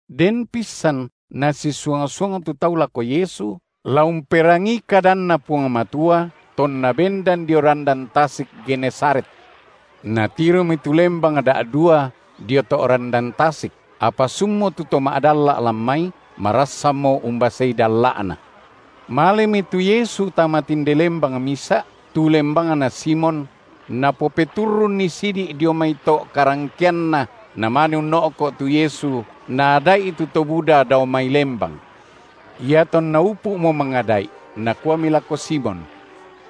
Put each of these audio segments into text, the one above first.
Den pissan nasisuang-suang tu tau lako Yesu, la umperangii kadanNa Puang Matua, tonna bendan dio randan tasik Genesaret. Natiromi tu lembang da’dua dio to’ randan tasik apa sunmo tu to ma’dalla’ lan mai, marassanmo umbasei dalla’na. Malemi tu Yesu tama tinde lembang misa’, tu lembangna Simon, Napopeturrunni sidi’ dio mai to’ karangkeanna, Namane unno’ko’ tu Yesu Naada’i tu to buda dao mai lembang. Iatonna upu’mo mangada’i, Nakuami lako Simon: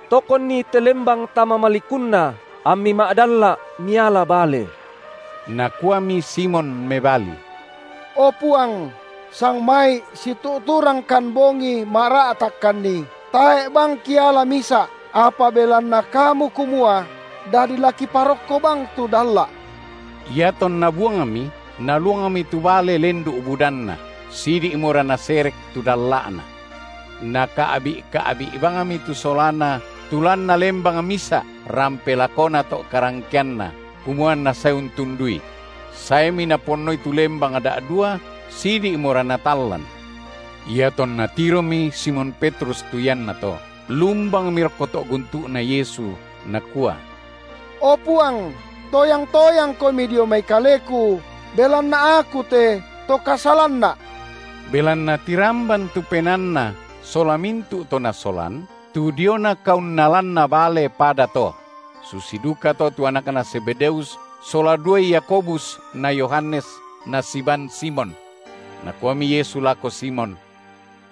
Tokonni te lembang tama malikunna, ammi ma’dalla’ miala bale. Nakuami Simon mebali: O Puang, sangmai’ situ’turangkan bongi mara’ takkanni, tae’ bang kiala misa’, apa belanna Kamu kumua, dadi la kiparokko bang tu dalla’. Iatonna buangmi, naluangmi tu bale lendu’ budanna, sidi’mora naserek tu dalla’na. Naka’bi’-ka’bi’ bangmi tu solana tu lanna lembang misa’ rampe lakona to’ karangkeanna, kumua anna sae untundui; saemi naponnoi tu lembang da’dua sidi’mora natallan. Iatonna tiromi Simon Petrus tu iannato, lumbangmi rokko to’ guntu’Na Yesu, nakua: O Puang, toyang-toyangKomi dio mai kaleku, belanna aku te to kasalanna’! Belanna tiramban tu penaanna sola mintu’ to nasolan, tu diona kaunnalanna bale pada to; susi dukato tu anakna Zebedeus sola duai Yakobus na Yohanes nasiban Simon. Nakuami Yesu lako Simon: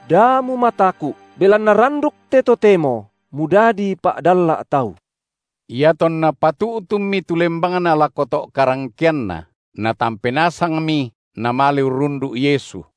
Da mumataku’, belanna randuk te totemo mudadi pa’dalla’ tau. Iatonna patu’tunmi tu lembangna lako to’ karangkeanna, natampe nasangmi namale urrundu’ Yesu.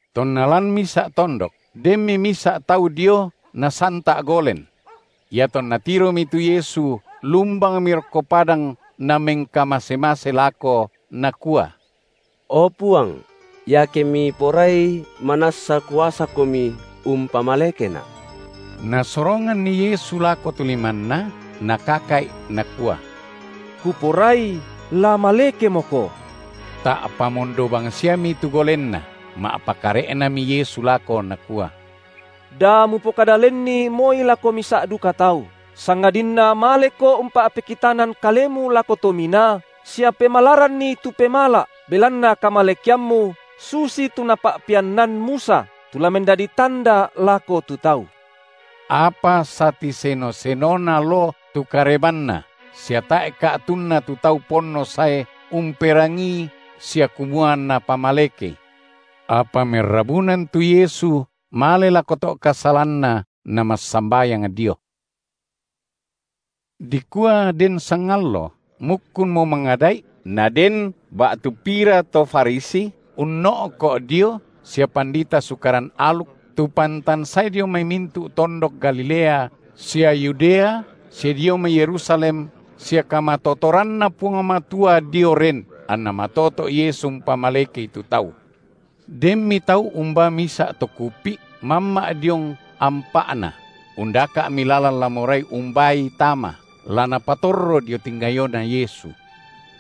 Tonna lan misa’ tondok, denmi misa’ tau dio nasanta’ golen. Iatonna tiromi tu Yesu lumbangmi rokko padang namengkamase-mase lako, nakua: O Puang! iake Miporai manassa kuasaKomi umpamalekena’! Nasoronganni Yesu lako tu limanNa, Nakaka’i, Nakua: Kuporai la malekemoko! Ta’pa mondo bangsiami tu golenna. Ma’pakare’nami Yesu lako, Nakua: Da mupokada lenni moi lako misa’ duka tau, sangadinna maleko umpa’pekitanan kalemu lako tominaa sia pemalaranni tu pemala’ belanna kamalekeammu susitu napa’peannan Musa, tu la mendadi tanda lako tu tau. Apa satiseno-senona loo tu karebanNa, sia tae’ ka’tunna tu tau ponno sae umperangii sia kumua anNa pamalekei. Apa merrabunan tu Yesu male lako to’ kasalanna Namassambayang dio. Dikua den sangallo mukkunmo mangada’i, naden ba’tu pira to Farisi unno’ko’ dio sia pandita Sukaran aluk, tu pantan sae dio mai mintu’ tondok Galilea sia Yudea, sia dio mai Yerusalem, sia kamatotoranNa Puang Matua dio ren, anNa matoto’ Yesu umpamalekei tu tau. Denmi tau umbaa misa’ to kupi’, mamma’ diong ampa’na, undaka’mi lalan la morai umbaai tama, la napatorro dio tingayoNa Yesu.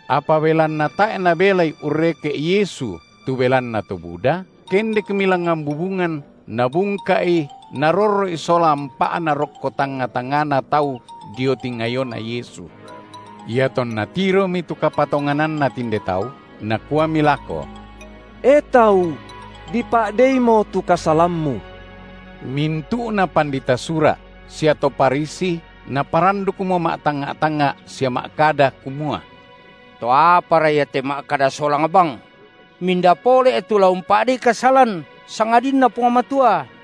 Apa belanna tae’ nabelai urreke’ Yesu tu belanna to buda, kendekmi langngan bubungan nabungka’i narorro’i sola ampa’na rokko tangnga-tangngana tau dio tingayoNa Yesu. Iatonna tiromi tu kapatongananna tinde tau, Nakuami lako: E tau! dipa’deimo tu kasalammu. Mintu’na pandita Sura’ sia to Farisi naparandukmo ma’tangnga’-tangnga’ sia ma’kada kumua: To apara Ia te ma’kada solang bang? Minda pole’ tu la umpa’dei kasalan, sangadinna Puang Matua?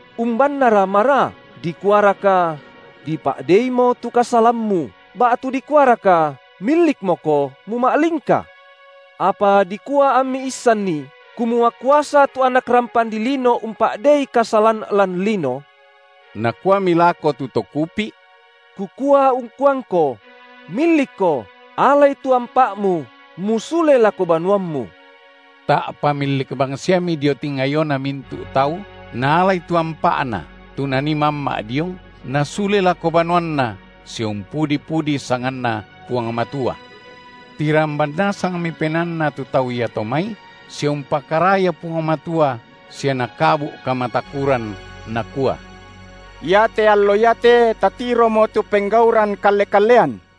Umbannara maraa, dikuaraka: Dipa’dei’mo tu kasalammu, ba’tu dikuaraka: Millikmoko muma’lingka? Apa dikua ammi issanni, kumua kuasa tu Anak rampan dilino umpa’dei kasalan lan lino, Nakuami lako tu to kupi’: Kukua ungkuangko: Millikko alai tu ampa’mu, musule lako banuammu! Ta’pa millik bangsiami dio tingayona mintu’ tau naalai tu ampa’na, tu nanii mamma’ diong, nasule lako banuanna, sia umpudi-pudi sanganNa Puang Matua. Tiramban nasangmi penaanna tu tau iato mai sia umpakaraya Puang Matua sia nakabu’ kamatakuran, nakua: Iate allo iate tatiromo tu penggauran kalle-kallean.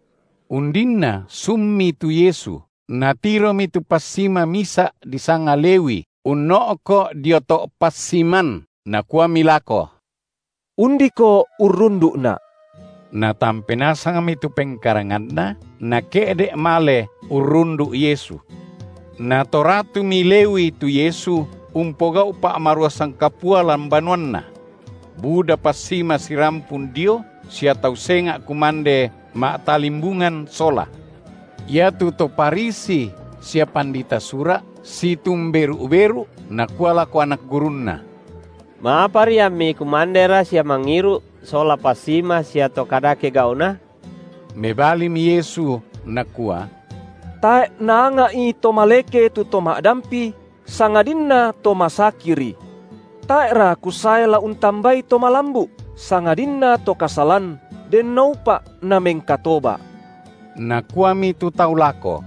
Undinna sunmi tu Yesu, Natiromi tu passima misa’ disanga Lewi unno’ko’ dio to’ passiman, Nakuami lako: Undiko urrundu’Na’. Natampe nasangmi tu pengkaranganna, nake’de’ male urrundu’ Yesu. Natoratumi Lewi tu Yesu umpogau’ pa’maruasan kapua lan banuanna; buda passima sirampun dio sia tau senga’ kumande ma’talimbungan sola. Iatu to Farisi sia pandita Sura’ situmberu’-beru’, nakua lako anak gurunNa: Ma’apari ammi kumandera sia mangiru’ sola passima sia to kadake gau’na? Mebalimi Yesu, Nakua: Tae’ naanga’i to maleke tu to ma’dampi, sangadinna to masakiri. Tae’ra Kusae la untambai to malambu’, sangadinna to kasalan, denoupa’ namengkatoba’. Nakuami tu tau lako: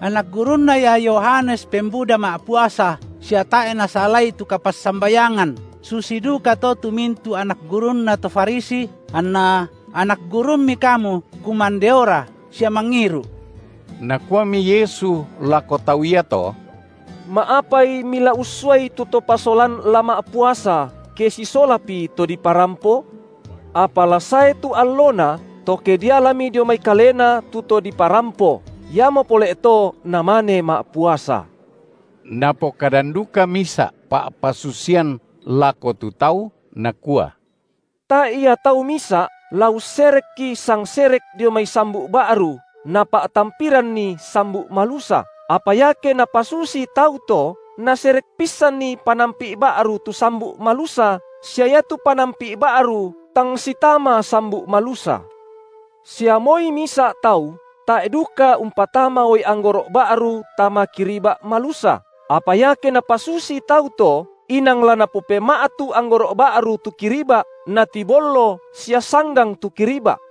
Anak gurunna ia Yohanes pembuda ma’puasa sia tae’ nasalai tu kapassambayangan, susi dukato tu mintu’ anak gurunna to Farisi, anna anak gurumMi kamu kumandeora sia mangiru’. Nakuami Yesu lako tau iato: Ma’apai mila ussuai tu to pasolan la ma’puasa, ke sisolapi to diparampo? Apa la sae tu allona, to ke dialami dio mai kalena tu to diparampo, iamo pole’ to namane ma’puasa. Napokadan duka misa’ pa’pasusian lako tu tau, Nakua: Tae’ ia tau misa’ la usserekki sangserek dio mai sambu’ ba’ru napa’tampiranni sambu’ malusa, apa iake napasusi tau to, naserek pissanmi panampi’ ba’ru tu sambu’ malusa sia iatu panampi’ ba’ru tang sitama sambu’ malusa. Sia moi misa’ tau tae’ duka umpatama uai anggoro’ ba’ru tama kiriba’ malusa, apa iake napasusi tau to, inang la napopema’tu anggoro’ ba’ru tu kiriba’ natibollo sia sanggang tu kiriba’;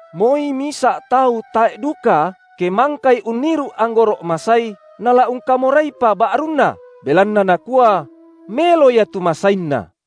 Moi misa’ tau tae’ duka, ke mangkai unniru’ anggoro’ masai, nala ungkamoraiopa ba’runna, belanna nakua: Melo ia tu masainna.